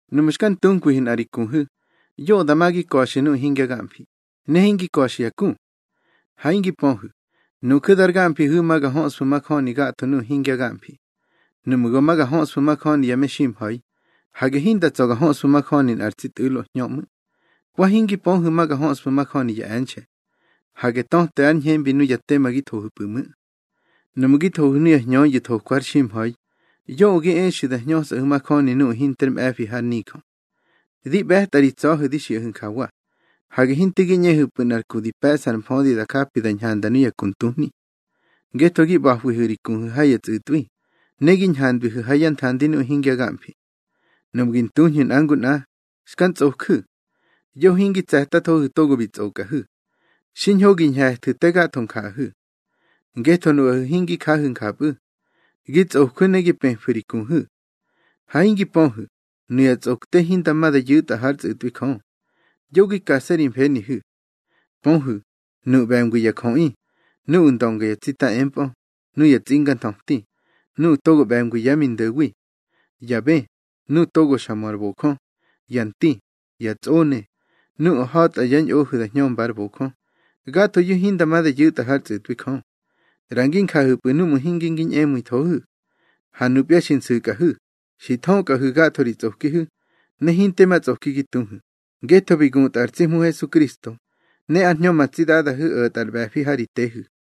Nuꞌmu̱ xka ntunkwihu̱ nꞌa ri kuhu̱, yoꞌö dama gi ka̱xu̱ nuꞌu̱ hingya gamfi, ne hingi ka̱xu̱ ya ku. Ha hingi pöhu̱, nuju̱ dar gamfihu̱ ma ga höꞌsfu̱ majöni gatho nuꞌu̱ hingya gamfi. Nuꞌmu̱ go ma gi hñöꞌsfu̱ majöni ya meximha̱i, hage hinda tsa̱ gi hñöꞌsfu̱ majöni nꞌar tsi tꞌu̱lo hñö ꞌmu̱. Wa hingi pöhu̱ ma ga höꞌsfu̱ majöni ya e̱nxe̱. Hage töte ár ñhembi nuya tema gi thohu̱pu̱ ꞌmu̱. Nuꞌmu̱ gi thohu̱ nuya hñöyu̱ thokwa har ximha̱i, yoꞌö gi exu̱ da hñösꞌahu̱ majöni nuꞌu̱ hinter mꞌe̱fi har nijö. Di ꞌbe̱tꞌa ri tsa̱hu̱ di xiꞌahu̱ njawa: Hage hinte gi ꞌñehu̱pꞌu̱ nꞌar ku di pe̱ꞌsa ar mfödi da japi da ñhanda nuya ku ntuhni. Ngetho gi ꞌba̱hwihu̱ ri kuhu̱ ha ya tsꞌu̱tꞌwi, ne gi ñhandwihu̱ ha yá nthandi nuꞌu̱ hingya gamfi. Nuꞌmu̱ gi ntuñhu̱ nꞌa ngu nꞌa, xka ntsꞌoju̱. Yoꞌö hingi tse̱tathohu̱ togo bi tsꞌokꞌahu̱. Xiñho gi ñhe̱thu̱ te gatho njaꞌahu̱. Ngetho nuꞌahu̱ hingi jahu̱ njapꞌu̱. Gi tsꞌojwu̱ ne gi pëfu̱ ri kuhu̱. Ha hingi pöhu̱, nuya tsꞌokte hinda ma da yu̱tꞌa hár tsꞌu̱tꞌwi Jö. Yo gi kase̱ ri mfenihu̱. Pöhu̱, nuꞌu̱ ꞌbe̱ngwi ya jöꞌi, nuꞌu̱ ndönga yá tsita empꞌö, nuya tsinganthöti, nuꞌu̱ togo ꞌbe̱ngwi yá mi ndo̱wi, ya bë, nuꞌu̱ togo xa mö ar bojö, ya nti, ya tsꞌone, nuꞌu̱ ha̱tꞌa yá ñꞌohu̱ da hñömba ár bojö, gathoyu̱ hinda ma da yu̱tꞌa hár tsꞌu̱tꞌwi Jö. ꞌRa ngi njahu̱pꞌu̱ núꞌmu̱ hinge ngi ñꞌemu̱ithohu̱. Ha nupya xi nsu̱kꞌahu̱, xi thökꞌahu̱ gatho ri tsꞌokihu̱, ne hinte ma tsꞌoki gi tuhu̱, ngetho bi gutꞌa ar tsi Hmu Hesukristo, ne ár Hñö ma tsi Dadahu̱ o̱tꞌa ar ꞌbe̱fi ha ri tehu̱.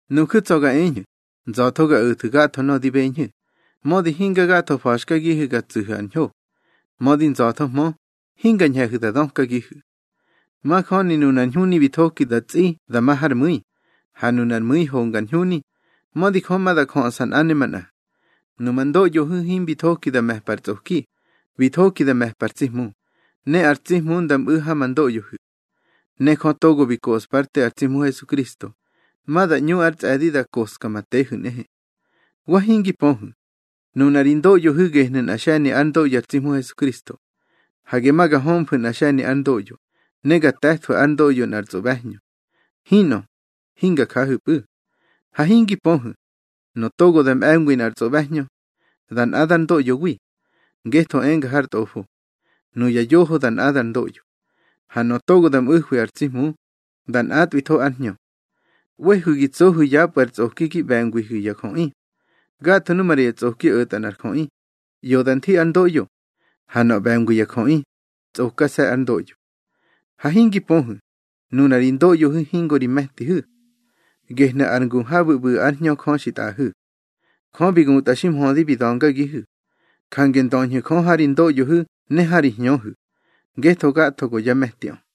Nuju̱ tsa̱ ga eñhu̱, nza̱tho ga o̱thu̱ gatho nöꞌö di beñhu̱, mödi hinga gatho fa̱xkagihu̱ ga tsu̱hu̱ ar ñho. Mödi nza̱thohmö, hinga ñhe̱hu̱ da dökagihu̱. Majöni nunar ñhuni bi thoki da tsꞌi da ma har mu̱i, ha nu ar mu̱i honga ar ñhuni, mödi Jö ma da jöꞌsa nꞌa ne manꞌa. Numa ndoꞌyohu̱ himbi thoki da me̱mpa ar tsꞌoki, bi thoki da me̱mpa ar tsi Hmu, ne ar tsi Hmu nda mꞌu̱ ha ma ndoꞌyohu̱. Ne Jö togo bi koꞌspa ár te ar tsi Hmu Hesukristo, ma da ꞌñu ár tsꞌe̱di da koꞌska ma tehu̱ nꞌehe. Wa hingi pöhu̱, nuna ri ndoꞌyohu̱ gehnu̱ nꞌa xe̱ni ár ndoꞌyo ar tsi Hmu Hesukristo. Hage ma ga hömfu̱ nꞌa xe̱ni ár ndoꞌyo, ne ga te̱thwu̱ ár ndoꞌyo nꞌar tsꞌoꞌbe̱hñö. Hinꞌö, hinga jahu̱pꞌu̱. Ha hingi pöhu̱, nöꞌö togo da mꞌe̱ngwi nꞌar tsꞌoꞌbe̱hñö, da nꞌadar ndoꞌyowi. Ngetho enga har Tꞌofo: Nuya yoho da nꞌadar ndoꞌyo. Ha nöꞌö togo da mꞌu̱hwi ar tsi Hmu, da nꞌatꞌwitho ár Hñö. ꞌWehu̱ gi tsohu̱ yapꞌu̱ ar tsꞌoki gi ꞌbe̱ngwihu̱ ya jöꞌi. Gatho nu maꞌra ya tsꞌoki o̱tꞌa nꞌar jöꞌi, ꞌyoda nthi ár ndoꞌyo, ha nöꞌö ꞌbe̱ngwi ya jöꞌi, tsꞌokase̱ ár ndoꞌyo. Ha hingi pöhu̱, nuna ri ndoꞌyohu̱ hingo ri me̱tihu̱, gehnu̱ ar ngu habu̱ ꞌbu̱ ár Hñö Jö xi tꞌaꞌahu̱. Jö bi gutꞌa xi mhödi bi da̱ngagihu̱. Jange ndöñhu̱ Jö ha ri ndoꞌyohu̱ ne ha ri hñöhu̱, ngetho gatho go yá me̱tiꞌö.